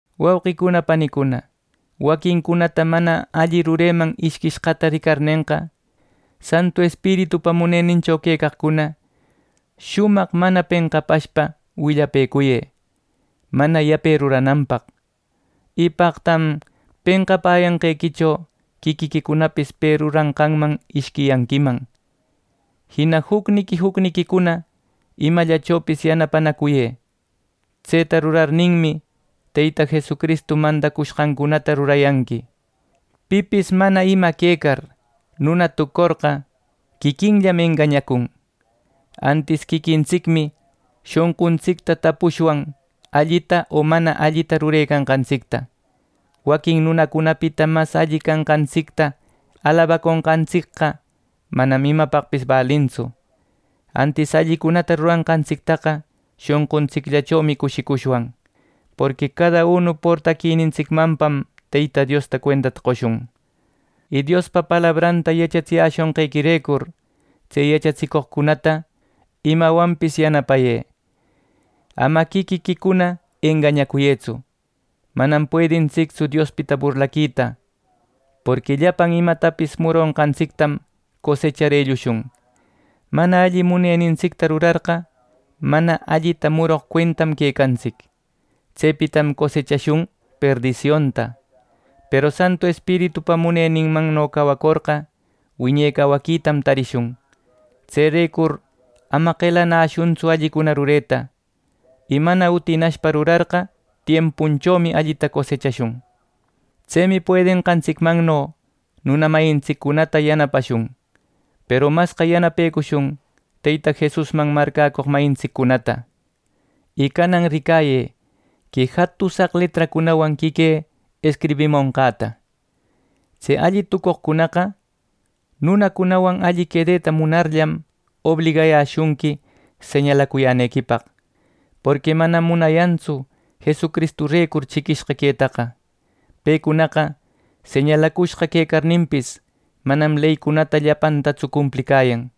Wauqicuna panicuna, waquincunata mana alli rureman ishquishqata ricarnenqa, Santu Espiritupa munenincho quecaqcuna shumaq mana penqapashpa willapëcuyë mana yape rurananpaq. Y ¡paqtam penqapäyanqequicho quiquiquicunapis pe ruranqanman ishquiyanquiman! Jina jucniqui jucniquicuna imallachopis yanapanacuyë. Tseta rurarninmi, Teyta Jesucristu mandacushqancunata rurayanqui. Pipis, mana ima quecar, nuna tucorqa quiquinllam engañacun. Antis quiquintsicmi shonquntsicta tapushwan allita o mana allita rurecanqantsicta. Waquin nunacunapita mas alli canqantsicta alabaconqantsicqa manam imapaqpis balintsu. Antis allicunata ruranqantsictaqa shonquntsicllachomi cushicushwan. Porqui cada unu portaquinintsicmanpam Teyta Diosta cuentata qoshun. Y Diospa palabranta yachatsiyäshonqequirecur tse yachatsicoqcunata imawanpis yanapayë. Ama quiquiquicuna engañacuyëtsu. Manam puedintsictsu Diospita burlaquita. Porqui llapan imatapis muronqantsictam cosechar ellushun. Mana alli munenintsicta rurarqa, mana allita muroq cuentam quecantsic. Tsepitam cosechashun perdisionta. Peru Santu Espiritupa muneninmanno cawacorqa wiñe cawaquitam tarishun. Tserecur ama qelanäshuntsu allicuna rureta, y mana utinashpa rurarqa, tiempunchomi allita cosechashun. Tsemi puedenqantsicmanno nuna mayintsiccunata yanapashun. Peru masqa yanapecushun Teyta Jesusman marcäcoq mayintsiccunata. Y canan ricayë, que jatusaq letracunawan quiquï escribimonqäta. Tse alli tucoqcunaqa nunacunawan alli quedeta munarllam, obligayäshunqui señalacuyänequipaq. Porqui manam munayantsu Jesucristurecur chiquishqa quetaqa. Pecunaqa señalacushqa quecarninpis, manam leycunata llapantatsu cumplicayan.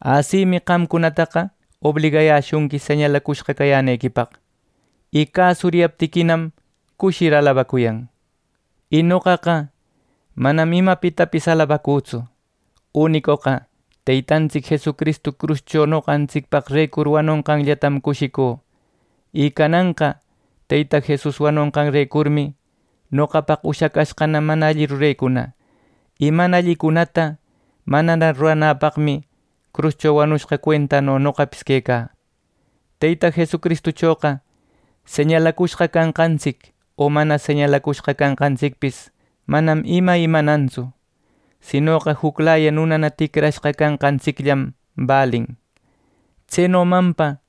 Asimi qamcunataqa obligayäshunqui señalacushqa cayänequipaq. Y cäsuriyaptiquinam, cushir alabacuyan. Y noqaqa manam imapitapis alabacütsu. Unicoqa Teytantsic Jesucristu cruscho noqantsicpaqrecur wanonqanllatam cushicü. Y cananqa Teyta Jesus wanonqanrecurmi noqapaq ushacashqana mana alli rurecuna. Y mana allicunata manana ruranäpaqmi cruscho wanushqa cuentano noqapis quecä. Teyta Jesucristuchoqa señalacushqa canqantsic, o mana señalacushqa canqantsicpis manam ima imanannatsu. Sinoqa juclaya nunana ticrashqa canqantsicllam balin. Tsenomanpa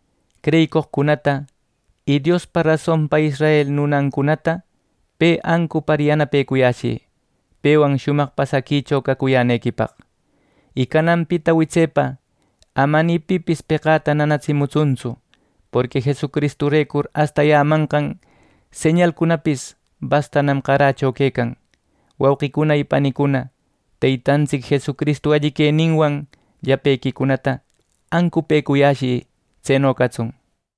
creyicoqcunata y Diospa rasonpa israel nunancunata pe ancupar yanapecuyäshï pewan shumaq pasaquicho cacuyänequipaq. Y cananpita witsepa ama ni pipis peqäta nanatsimutsuntsu. Porqui Jesucristurecur astayämanqan señalcunapis bastanam qarächo quecan. Wauqïcuna y panicuna, Teytantsic Jesucristu alli queninwan llapequicunata ancupëcuyäshï. Tseno catsun.